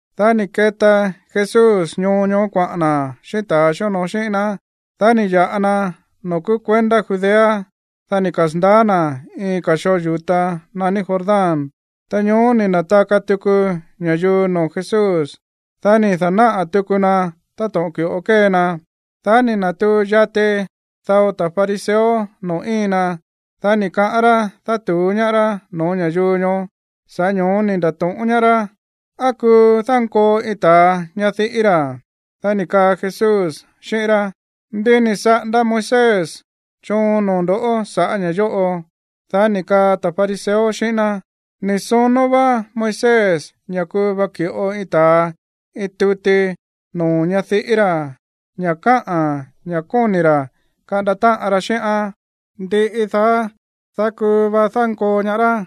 Dá ni̱ keta Jesús ñoo ñoó kuaꞌa̱n na̱ xíꞌín ta̱ xíonoo xíꞌín ná. Dá ni̱ ya̱ꞌa na noo̱ kúú kuendá Judea. Dá ni̱ kasa̱ndaá na̱ iin ka̱ xoo yu̱ta naní Jordán. Ta ñóó ni̱ na̱taka tuku ña̱yuu noo̱ Jesús. Dá ni̱ da̱náꞌa̱ tuku na táto̱ꞌon ki̱ꞌo kée na. Dá ni̱ na̱tuu yati dao ta̱ fariseo noo̱ íin na, dá ni̱ kaꞌán rá dátu̱ú ñaá rá no̱ó ña̱yuu ñoó. Sa̱ꞌá ño̱ó ni̱ nda̱to̱ꞌón ñaá rá: ―¿Á kuu dánkoo iin ta̱a ñadiꞌí ra̱? Dá ni̱ kaa Jesús xíꞌín rá: ―¿Ndí ni̱ saꞌanda Moisés choon noo̱ ndo̱ sa̱ꞌá ña̱ yóꞌo? Dá ni̱ kaa ta̱ fariseo xíꞌín ná: ―Ni̱ sonó vá Moisés ña̱ kuu va ki̱ꞌo iin ta̱a iin tuti noo̱ ñadiꞌí ra̱ ña̱ káꞌa̱n ña̱ kóni̱ ra̱ kaꞌanda táꞌan ra xíꞌán. Ndiꞌi daá, dá kuu va dánkoo ñaá rá.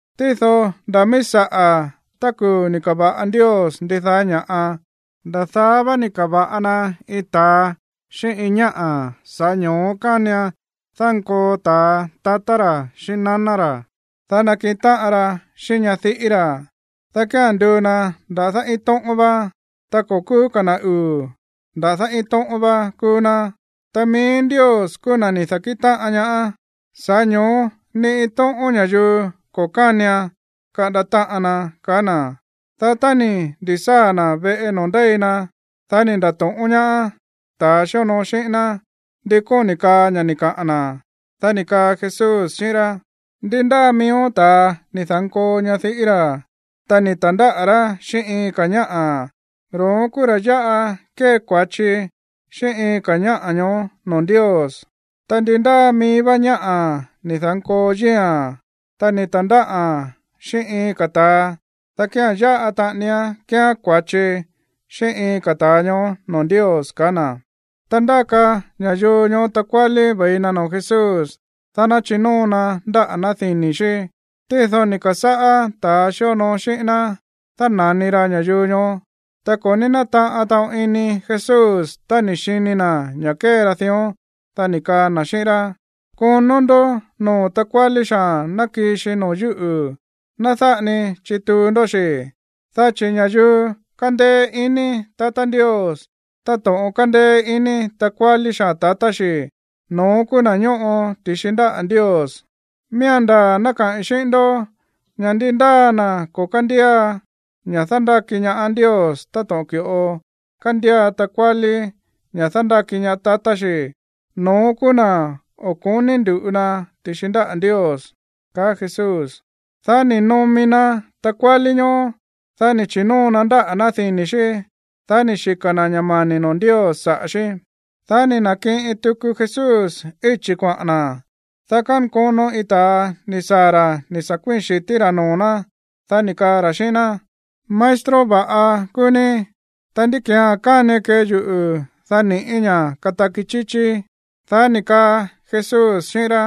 tído nda̱ míí saꞌa̱, tá kuu̱ ni̱ ka̱va̱ꞌa Ndios ndidaá ña̱ꞌa, “nda̱ daá vá ni̱ ka̱va̱ꞌa na iin ta̱a xíꞌín iin ñáꞌa̱”. “Sa̱ꞌá ño̱ó kánian dánkoo ta̱a tatá ra̱ xíꞌín naná ra̱, dá nakiꞌin táꞌan ra xíꞌín ñadiꞌí ra̱, dá kía̱n nduu na nda̱dá iin tóꞌón vá.” Ta ko̱ kúú ka̱ na̱ uu̱, nda̱dá iin tóꞌón vá kúú ná. Ta mií Ndios kúú na̱ ni̱ da̱kíꞌin táꞌan ñaá, sa̱ꞌá ño̱ó ni iin tóꞌón ña̱yuu ko̱ kánian kaꞌanda táꞌan na ―ka̱á na̱. Dá tá ni̱ ndi̱sáa̱ na̱ veꞌe noo̱ ndéi na, dá ni̱ nda̱to̱ꞌón ñaá ta̱ xíonoo xíꞌín ná ndi kóni̱ kaa ña̱ ni̱ kaꞌa̱n na̱. Dá ni̱ kaa Jesús xíꞌín rá: ―Ndi ndáa miíó ta̱a ni̱ da̱nkoo ñadiꞌí ra̱, ta ni̱ ta̱ndáꞌa̱ rá xíꞌín iin ka̱ ñáꞌa̱, ro̱ón kúú ra̱ yáꞌa kée kua̱chi xíꞌín iin ka̱ ñáꞌa̱ ñoó noo̱ Ndios. Ta ndi ndáa mií vá ñáꞌa̱ ni̱ da̱nkoo yíi̱a̱n, ta ni̱ ta̱ndáꞌa̱n xíꞌín iin ka̱ ta̱a, dá kía̱n yáꞌa taꞌanián kéeán kua̱chi xíꞌín iin ka̱ ta̱a ñoó noo̱ Ndios ―kaá na̱. Ta ndáka ña̱yuu ñoó takuálí ve̱i na noo̱ Jesús, dá ná chinóo na ndáꞌa̱ ná dini̱ xí. Tído ni̱ ka̱sáꞌá ta̱a xíonoo xíꞌín ná dána̱ni ra ña̱yuu ñoó. Ta ko̱ ní nátaꞌan taꞌon ini Jesús tá ni̱ xini na̱ ña̱ kée ra dión. Dá ni̱ kaa na̱ xíꞌín rá: ―Konó ndó noo̱ takuálí xaa̱n ná kii xi noo̱ yúꞌu̱. Ná dáꞌa ni chituu ndó xi̱, dá chi̱ ña̱yuu kándéé ini tatá Ndios táto̱ꞌon kándéé ini takuálí xaa̱n tatá xi̱, no̱ón kúú na̱ ñóꞌo ti̱xi ndáꞌa̱ Ndios. Miía̱n ndaa̱ ná kaꞌi̱n xíꞌín ndó ña̱ ndi ndáa na̱ ko̱ kándía ña̱ dándáki ñaá Ndios táto̱ꞌon ki̱ꞌo kándía takuálí ña̱ dándáki ñaá tatá xi̱, no̱ón kúú na̱ o̱ ko̱ní ndu̱ꞌu na ti̱xi ndáꞌa̱ Ndios ―ka̱á Jesús. Dá ni̱ nomi na takuálí ñoó. Dá ni̱ chi̱nóo na ndáꞌa̱ ná dini̱ xí. Dá ni̱ xika̱ na̱ ña̱ mani̱ noo̱ Ndios saꞌa̱ xí. Dá ni̱ na̱kiꞌin tuku Jesús íchi̱ kuaꞌa̱n na̱, dá kánkono iin ta̱a ni̱ saa̱ ra̱ ni̱ sa̱ kuíi̱n xi̱tí rá noo̱ ná. Dá ni̱ kaa ra̱ xíꞌín ná: ―Maestro va̱ꞌa kúú ní. Ta, ¿ndí ki̱án kánian kee yuꞌu̱, dá ni̱ꞌí ña̱ kataki chíchíí? Dá ni̱ kaa Jesús xíꞌín rá: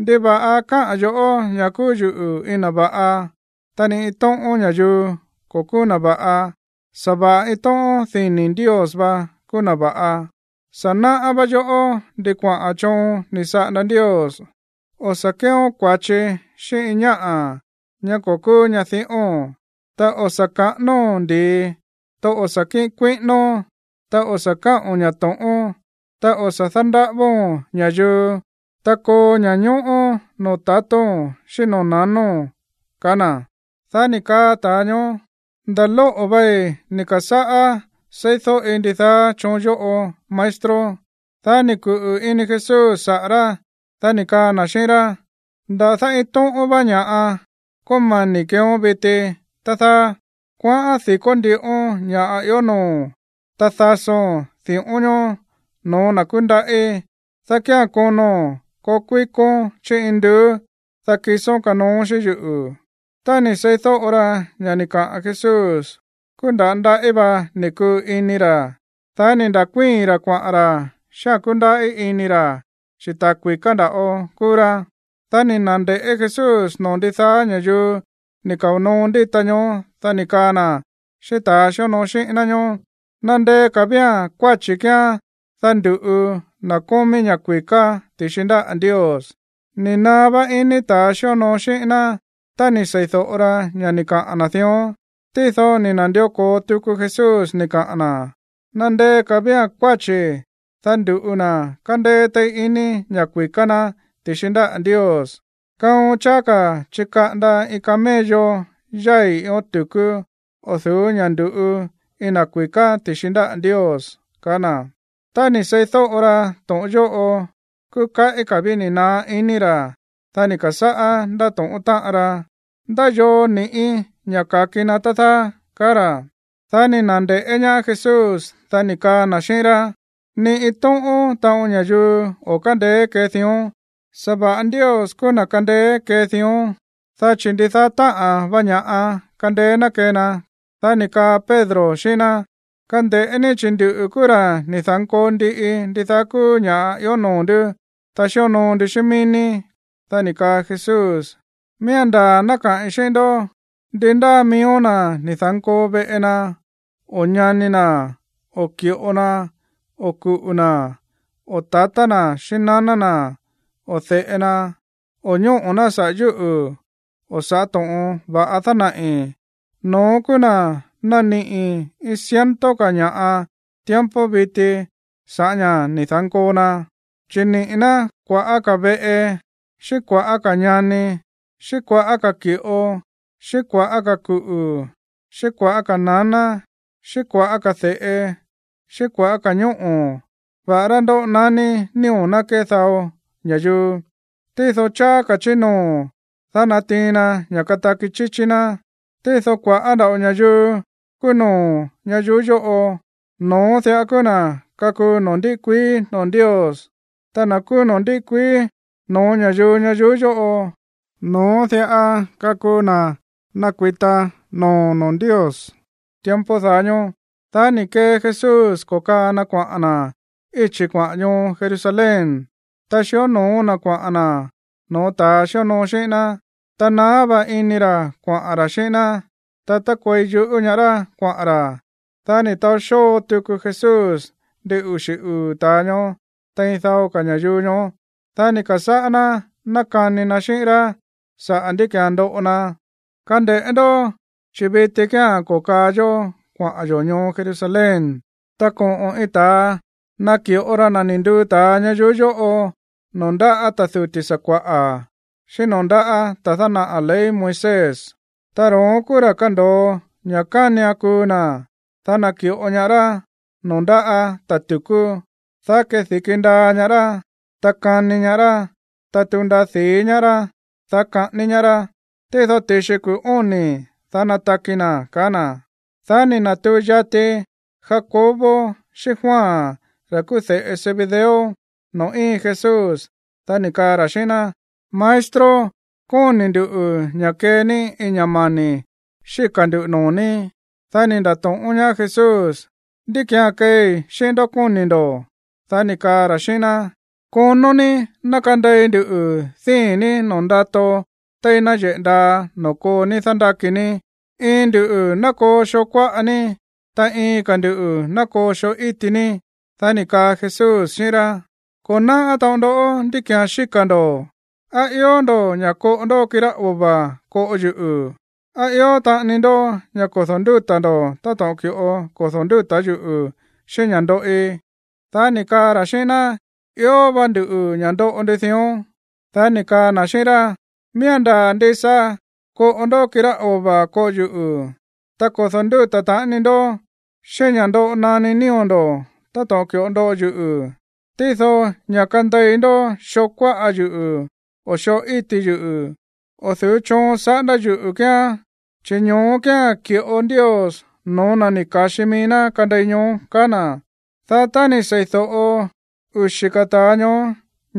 ―¿Ndiva̱ꞌa káꞌa̱n yo̱ꞌó ña̱ kúú yuꞌu̱ iin na̱ va̱ꞌa? Ta ni iin tóꞌón ña̱yuu ko̱ kúú na̱ va̱ꞌa. Sa̱va̱ꞌa iin tóꞌón dini̱ Ndios vá kúú na̱ va̱ꞌa. “Sa̱ náꞌá vá yoꞌó ndi kuaꞌa̱n choon ni̱ saꞌanda Ndios: o̱ sa̱ kéeón kua̱chi xíꞌín iin ñáꞌa̱, ñá ko̱ kúú ñadiꞌóo̱n, ta o̱ sa̱ kaꞌánóo̱n ndi̱i, ta o̱ sa̱ kíꞌin kuíꞌínón, ta o̱ sa̱ káꞌo̱n ña̱ to̱ꞌón, ta o̱ sa̱ dándaꞌávóo̱n ña̱yuu, ta koo ña̱ñóꞌó noo̱ tatóo̱n xíꞌín noo̱ nanóo̱n” ―kaá na̱. Dá ni̱ kaa ta̱a ñoó: ―Nda̱ lóꞌo̱ vei ni̱ ka̱sáꞌá seídóꞌi ndidaá choon yóꞌo, maestro. Dá ni̱ kuꞌu̱ ini Jesús saꞌa̱ rá, dá ni̱ kaa na̱ xíꞌín rá: ―Nda̱dá iin tóꞌón vá ña̱ꞌa kómani̱ keeón viti, tá dáá. Kuaꞌán di̱kó ndiꞌón ña̱ꞌa ió noo̱o̱n. Ta dasón di̱ꞌón ñoó no̱ó na̱ kúndaꞌí, dá kía̱n kono̱n koo kui̱kón chí induú. Dá kisón kanoón xíꞌín yuꞌu̱. Tá ni̱ seídóꞌo ra ña̱ ni̱ kaꞌa̱n Jesús, kúú nda̱á ndaꞌí va ni̱ kuu ini ra̱, dá ni̱ nda̱kuíi̱n ra̱ kuaꞌa̱n ra̱ xíꞌa̱n kúndaꞌí ini ra̱, chi̱ ta̱ kui̱ká nda̱ꞌo kúú rá. Dá ni̱ na̱nde̱ꞌé Jesús noo̱ ndidaá ña̱yuu ni̱ kao̱ noo ndíta ñoó. Dá ni̱ kaa na̱ xíꞌín ta̱ xíonoo xíꞌín ná ñóó: ―¡Nandeé ka̱ ví kuáchi̱ kíán, dá ndu̱ꞌu na̱ kómí ña̱ kui̱ká ti̱xi ndáꞌa̱ Ndios! Ni̱ naá vá iní ta̱ xíonoo xíꞌín ná tá ni̱ sei̱do̱ꞌo ra ña̱ ni̱ kaꞌa̱n na̱ dión. Tído ni̱ na̱ndió ko̱o tuku Jesús ni̱ kaꞌa̱n na̱: ―¡Nandeé ka̱ ví kuáchi̱, dá ndu̱ꞌu na̱ kándéé téí iní ña̱ kui̱ká ná ti̱xi ndáꞌa̱ Ndios! Kaon cháá ka̱ chikaꞌanda iin camello yái̱ iin ión tu̱kú o̱ du̱ú ña̱ ndu̱ꞌu iin na̱ kui̱ká ti̱xi ndáꞌa̱ Ndios ―kaá na̱. Tá ni̱ seídóꞌo ra to̱ꞌon yóꞌo, kúú kaꞌí ka̱ ví ni̱ naá iní ra̱. Dá ni̱ ka̱sáꞌá ndáto̱ꞌón táꞌan ra: ―¿Ndá yoo ni̱ꞌí ña̱ ka̱ki na, tá dáá? ―kaá ra̱. Dá ni̱ na̱nde̱ꞌé ñaá Jesús, dá ni̱ kaa na̱ xíꞌín rá: ―Ni iin tóꞌón taꞌon ña̱yuu o̱ kándeé kee dión, sa̱va̱ꞌa Ndios kúú na̱ kándeé kee dión, dá chi̱ ndidaá táꞌa̱n va ña̱ꞌa kándeé ná kee na. Dá ni̱ kaa Pedro xíꞌín ná: ―Kande̱ꞌé ní, chi̱ nduꞌu̱ kúú ra̱ ni̱ da̱nkoo ndiꞌi ndidaá kúú ña̱ꞌa ió noo̱ ndú, ta xíonoo ndu xíꞌín mií ní. Dá ni̱ kaa Jesús: ―Miía̱n ndaa̱ ná káꞌi̱n xíꞌín ndó, ndi ndáa miíó na̱ ni̱ da̱nkoo veꞌe na, o ñani na̱, o ki̱ꞌo na, o kuꞌu̱ na̱, o tatá na̱ xíꞌín naná na̱, o de̱ꞌe na, o ñóꞌo̱ ná saꞌa̱ yúꞌu̱ o saꞌa̱ to̱ꞌon va̱ꞌa dánaꞌi̱, no̱ón kúú na̱ naniꞌi̱ iin ciento ka̱ ña̱ꞌa tiempo viti sa̱ꞌá ña̱ ni̱ da̱nkoo na, chi̱ niꞌi̱ ná kua̱ꞌá ka̱ veꞌe, xíꞌín kua̱ꞌá ka̱ ñani, xíꞌín kua̱ꞌá ka̱ ki̱ꞌo, xíꞌín kua̱ꞌá ka̱ kuꞌu̱, xíꞌín kua̱ꞌá ka̱ naná, xíꞌín kua̱ꞌá ka̱ de̱ꞌe, xíꞌín kua̱ꞌá ka̱ ñóꞌo̱, va̱ꞌará ndoꞌo naní nío̱ ná kee dao ña̱yuu. Tído cháá ka̱ chí noo̱, dá natiin na ña̱ kataki chíchí ná. Tído kua̱ꞌá nda̱ꞌo ña̱yuu kúú no̱ó ñayuú yóꞌo, no̱ón diꞌa kúú na̱ kakuu noo̱ ndíꞌi kuií noo̱ Ndios. Ta na̱ kúú noo̱ ndíꞌi kuií noo̱ ña̱yuu ñayuú yóꞌo, no̱ón diꞌa kakuu na̱ nakuita no̱ó noo̱ Ndios tiempo daá ñóó. Dá ni̱ kee Jesús ko̱kaa na kuaꞌa̱n na̱ íchi̱ kuaꞌa̱n ñoo Jerusalén, ta xió no̱ó na̱ kuaꞌa̱n na̱ no̱ó ta̱ xíonoo xíꞌín ná. Ta naá vá iní ra̱ kuaꞌa̱n ra̱ xíꞌín ná, ta tákuei yuꞌú ñaá rá kuaꞌa̱n ra̱. Dá ni̱ taó xóo tuku Jesús ndin uxi̱ uu̱ ta̱a ñoó tein dao ka̱ ña̱yuu ñoó. Dá ni̱ ka̱sáꞌá ná nákani na xíꞌín rá sa̱ꞌá ndí ki̱án ndoꞌo na: ―Kande̱ꞌé ndó, chi̱ viti kía̱n ko̱kaa yó kuaꞌa̱n yo̱ ñoo Jerusalén. Ta koꞌo̱n iin ta̱a naki̱ꞌo ra na̱ ni̱ nduu ta̱a ñayuú yóꞌo noo̱ ndáꞌa̱ ta̱ duti̱ sakua̱ꞌa̱, xíꞌín noo̱ ndáꞌa̱ ta̱a dánaꞌa̱ ley Moisés. Ta ro̱ón kúú ra̱ kando̱o ña̱ kánian kuu na̱. Dá naki̱ꞌo ñaá rá noo̱ ndáꞌa̱ ta̱ tu̱kú. Dá kedi̱ki ndaa ñaá rá, ta kani ñaá rá, ta tuu ndaa di̱í ñaá rá, dá kaꞌání ñaá rá. Tído ti̱xi kuu̱ óni̱, dá nataki na̱ ―kaá na̱. Dá ni̱ na̱tuu yati Jacobo xíꞌín Juan, ra̱ kúú de̱ꞌe Zebedeo, noo̱ íin Jesús. Dá ni̱ kaa ra̱ xíꞌín ná: ―Maestro, kóni̱ nduꞌu̱ ña̱ kee ní iin ña̱ mani̱ xíka̱ nduꞌu̱ noo̱ ní. Dá ni̱ nda̱to̱ꞌón ñaá Jesús: ―¿Ndí ki̱án keei xíꞌín ndó, kóni̱ ndo̱? Dá ni̱ kaa ra̱ xíꞌín ná: ―Konó ní ná kande̱i ndu díi̱n ní noo̱ ndato téí náyeꞌe̱ ndaa noo̱ koo ní dándáki ní. Iin nduꞌu̱ ná koo xoo kuáꞌa ní, ta iin ka̱ ndu̱ ná koo xoo íti ní. Dá ni̱ kaa Jesús xíꞌín rá: ―Ko̱ náꞌá taꞌon ndó ndí ki̱án xíka̱ ndo̱. ¿Á ió ndo̱ꞌó ña̱ koꞌo ndó kirá ova̱ koꞌo yuꞌu̱? ¿Á ió taꞌani ndó ña̱ kodo̱ ndúta̱ ndo̱ táto̱ꞌon ki̱ꞌo kodo̱ ndúta̱ yuꞌu̱ xíꞌín ña̱ ndoꞌi? Dá ni̱ kaa ra̱ xíꞌín ná: ―Ió vá nduꞌu̱ ña̱ ndoꞌo ndu dión. Dá ni̱ kaa na̱ xíꞌín rá: ―Miía̱n ndaa̱ ndisa koꞌo ndoꞌó kirá ova̱ koꞌo yuꞌu̱, ta kodo̱ ndúta̱ taꞌani ndó xíꞌín ña̱ ndoꞌo naní nío̱ ndo̱ táto̱ꞌon ki̱ꞌo ndoꞌo yuꞌu̱. Tído ña̱ kande̱i ndó xoo kuáꞌa yuꞌu̱ o xoo íti yuꞌu̱, o̱ du̱ú choon saꞌándá yuꞌu̱ kíán. Chi̱ ño̱ó kía̱n ki̱ꞌo Ndios no̱ó na̱ ni̱ ka̱xi mií ná kande̱i ñoó ―kaá na̱. Dá tá ni̱ sei̱do̱ꞌo uxi̱ ka̱ ta̱a ñoó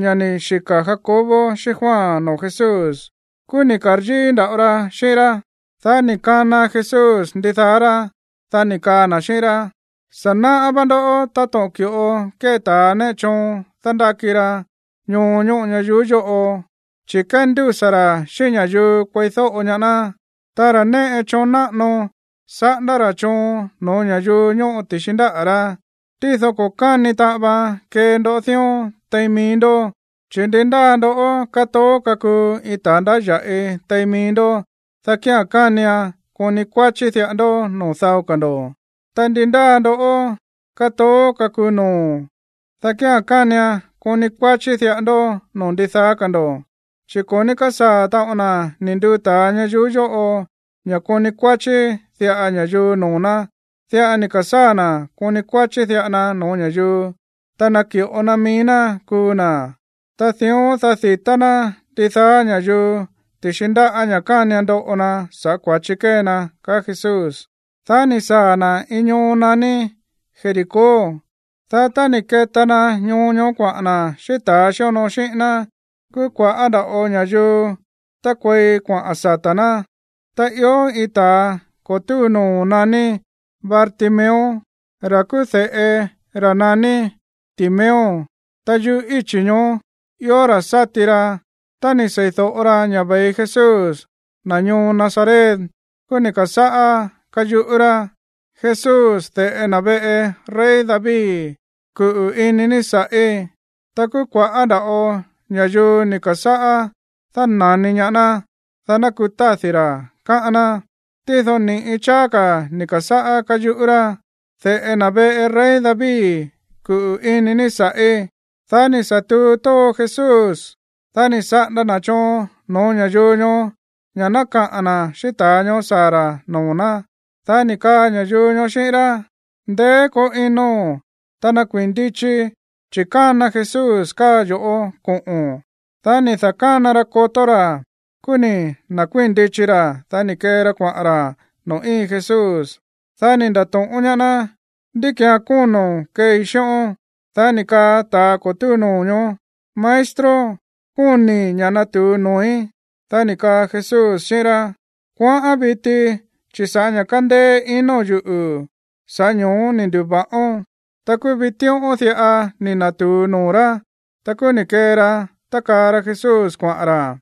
ña̱ ni̱ xika̱ Jacobo xíꞌín Juan noo̱ Jesús, kúú ni̱ ka̱ryíí nda̱ꞌo ra xíꞌín rá. Dá ni̱ kana Jesús ndidaá rá, dá ni̱ kaa na̱ xíꞌín rá: ―Sa̱ náꞌá vá ndó táto̱ꞌon ki̱ꞌo kée ta̱ néꞌe choon dándáki ra ñoo ñóꞌo ñayuú yóꞌo, chi̱ kéndúsa̱ ra̱ xíꞌín ña̱yuu kueídóꞌo ñaá ná. Ta ra̱ néꞌe choon náꞌano, saꞌándá ra̱ choon no̱ó ña̱yuu ñóꞌo ti̱xi ndáꞌa̱ rá. Tído ko̱ káni taꞌan vaan kee ndó dión tein mií ndó. Chi̱ ndi ndáa ndoꞌó kátoó kakuu iin ta̱a ndáya̱ꞌi tein mií ndó, dá kía̱n kánian koni kuáchí diꞌa ndó noo̱ dao ka̱ ndo̱. Ta ndi ndáa ndoꞌó kátoó kakuu noo̱, dá kía̱n kánian koni kuáchí diꞌa ndó noo̱ ndidaá ka̱ ndo̱. Chi̱ ko̱ ní kásaa̱ taꞌon na̱ ni̱ nduu ta̱a ñayuú yóꞌo ña̱ koni kuáchí diꞌa ña̱yuu noo̱ ná. Diꞌa ni̱ ka̱sáa̱ na̱ koni kuáchí diꞌa na no̱ó ña̱yuu, ta naki̱ꞌo na mií ná kuu na̱, ta dión, dá di̱tá ná ndidaá ña̱yuu ti̱xi ndáꞌa̱ ña̱ kánian ndoꞌo na sa̱ꞌá kua̱chi kée na ―kaá Jesús. Dá ni̱ saa̱ na̱ iin ñoo naní Jericó. Dá tá ni̱ keta na ñoo ñoó kuaꞌa̱n na̱ xíꞌín ta̱ xíonoo xíꞌín ná, kúú kua̱ꞌá nda̱ꞌo ña̱yuu tákuei kuaꞌa̱n sata̱ ná. Ta ió iin ta̱a ko̱ túu noo̱ naní Bartimeo, ra̱ kúú de̱ꞌe ra̱ naní Timeo. Ta yuꞌú íchi̱ ñoó ió ra̱ sáti ra. Tá ni̱ sei̱do̱ꞌo ra ña̱ ve̱i Jesús, na̱ ñoo Nazaret, kúú ni̱ ka̱sáꞌá káyuꞌú rá: ―¡Jesús, de̱ꞌe na̱ veꞌe rey David, kuꞌu̱ ini ní sa̱ꞌí! Ta kúú kua̱ꞌá nda̱ꞌo ña̱yuu ni̱ ka̱sáꞌá dána̱ni ñaá ná, dá ná kutádi̱ rá, káꞌán ná. Tído ni̱ꞌi cháá ka̱ ni̱ ka̱sáꞌá káyuꞌú rá: ―¡De̱ꞌe na̱ veꞌe rey David, kuꞌu̱ ini ní sa̱ꞌí! Dá ni̱ sa̱ tuu tóo Jesús, dá ni̱ saꞌanda na̱ choon no̱ó ña̱yuu ñoó ña̱ ná kaꞌa̱n na̱ xíꞌín ta̱a ñoó saa̱ ra̱ noo̱ ná. Dá ni̱ kaa ña̱yuu ñoó xíꞌín rá: ―Ndeé koo ino̱n, ta nakuii̱n ndichi, chi̱ kána Jesús káa yo̱ꞌó koꞌo̱n. Dá ni̱ da̱kána ra kotó ra̱. Kúú ni̱ na̱kuii̱n ndichi ra̱. Dá ni̱ kee ra kuaꞌa̱n ra̱ noo̱ íin Jesús. Dá ni̱ nda̱to̱ꞌón ñaá ná: ―¿Ndí ki̱án kóno̱n keei xíꞌón? Dá ni̱ kaa ta̱ ko̱ túu noo̱ ñoó: ―Maestro, kóni̱i̱ ña̱ natu̱u noo̱í. Dá ni̱ kaa Jesús xíꞌín rá: ―Kuaꞌán viti, chi̱ sa̱ꞌá ña̱ kándéé ino̱n yuꞌu̱, sa̱ꞌá ño̱ó ni̱ ndu̱va̱ꞌón. Ta kúú vitíꞌón diꞌa ni̱ na̱tu̱u noo̱ rá. Ta kúú ni̱ kee ra tákaa ra Jesús kuaꞌa̱n ra̱.